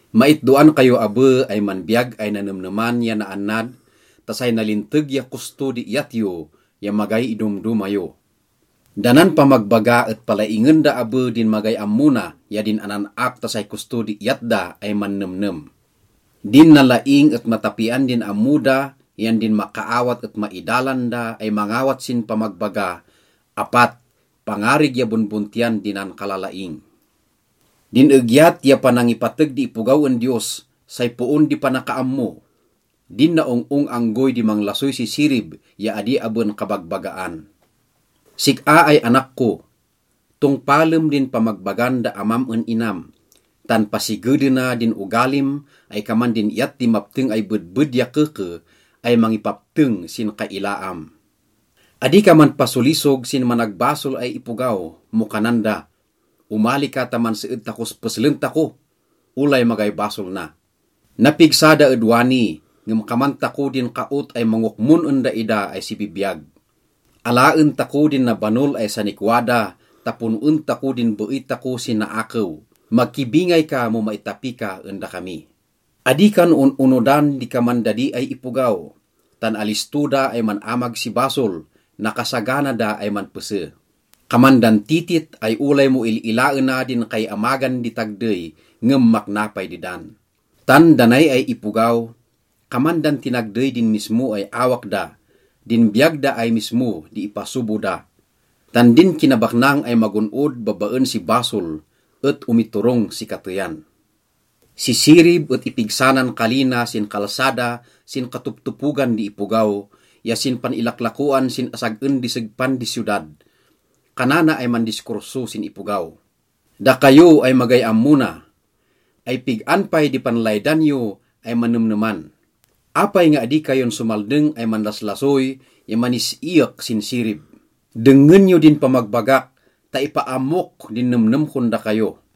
Maitdoan kayo abe ay manbiyag ay nanemneman ya naannad ta say nalinteg ya kosto di iyat yo ya magay idomdoma yo. Da nan pamagbaga et palaingen da abe din magay ammo na ya din anan-ak ta say kosto di iyat da ay mannemnem. Din nalaing et matapian din ammo da yan din makaawat et maidalan da ay mangawat sin pamagbaga, apat, pangarig ya bonbontiyan di nankalalaing. Din egyat ya panangipateg di ipogaw en Diyos, say poon di panakaammo. Din naong-ong anggoy di manglasoy si sirib ya adi aben kabagbagaan. Sik-a ay anak ko, tongpalem din pamagbagan da amam en inam, tan pasigedena din ogalim ay kaman din iyat di mapteng ay bedbed ya keke ay mangipapteng sin kailaam. Adi ka manpasolisog sin managbasol ay ipogaw mo kanan da, “Omali ka ta manseed takos peslen tako, olay magay basol na. Napigsa da ed wani ngem kaman tako din kaot ay mangokmon en daida ay sibibiyag. Alaen tako din nabanol ay sanikwa da ta pon-en tako din beey tako si naakew. Makibingay ka mo maitapi ka en dakami.” Adi kan on-onodan di kaman dadi ay ipogaw tan alisto da ay man-amag si basol, nakasagana da ay manpese. Kaman dan titit ay olay mo il-ilaena din kaiamagan di tagdey, ngem makna pay dedan. Tan da nay ay ipogaw, kaman dan tinagdey din mismo ay awak da, din biyag da ay mismo di ipasobo da. Tan din kinabaknang ay magon-od babaen si basol et omiturong si kateyan. Si Sirib et ipigsa nan kali na sin kalsada sin katoptopogan di ipogaw, ya sin pan-ilaklakoan sin asag-en di segpan di siyodad. Kanana ay mandiskurso sin ipogaw: “Dakayo ay magay ammo na, ay pig-an pay di panlaydan yo ay manemneman? Apay nga adi kayon somaldeng ay manlaslasoy ya manis-iyek sin sirib? Dengngen yo din pamagbagak ta ipaammok din nemnem kon dakayo.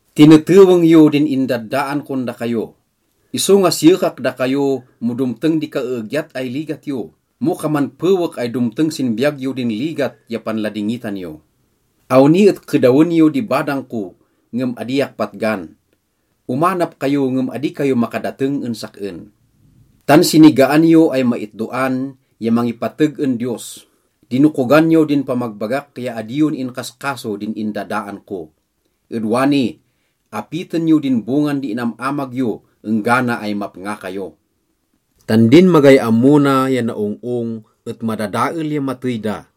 Tineteweng yo din indaddaan kon dakayo. Isonga siyekak dakayo mo domteng di kaeegyat ay ligat yo, mo kaman pewek ay domteng sin biyag yo din ligat ya panladingitan yo. Awni et kedawen yo di badang ko ngem adiak patgan, omanap kayo ngem adi kayo makadateng en sak-en. Tan sinigaan yo ay maitdoan ya mangipateg en Diyos. Dinokogan yo din pamagbagak ya adi yon inkaskaso din indadaan ko. Ed wani, apiten yo din bongan di inam-amag yo enggana ay mapnga kayo. Tan din magay ammo na ya naong-ong et madadael ya matey da,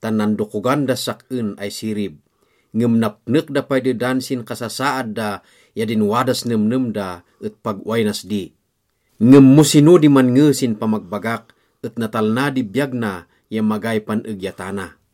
tan nandokogan das sak-en ay Sirib, ngem napnek da pay dedan sin kasasaad da yan din wadas nemnem da et pag ‘Oway nas di.’ Ngem mo sino di mannge sin pamagbagak et natalna di biyag na ya magay pan-egyatana.”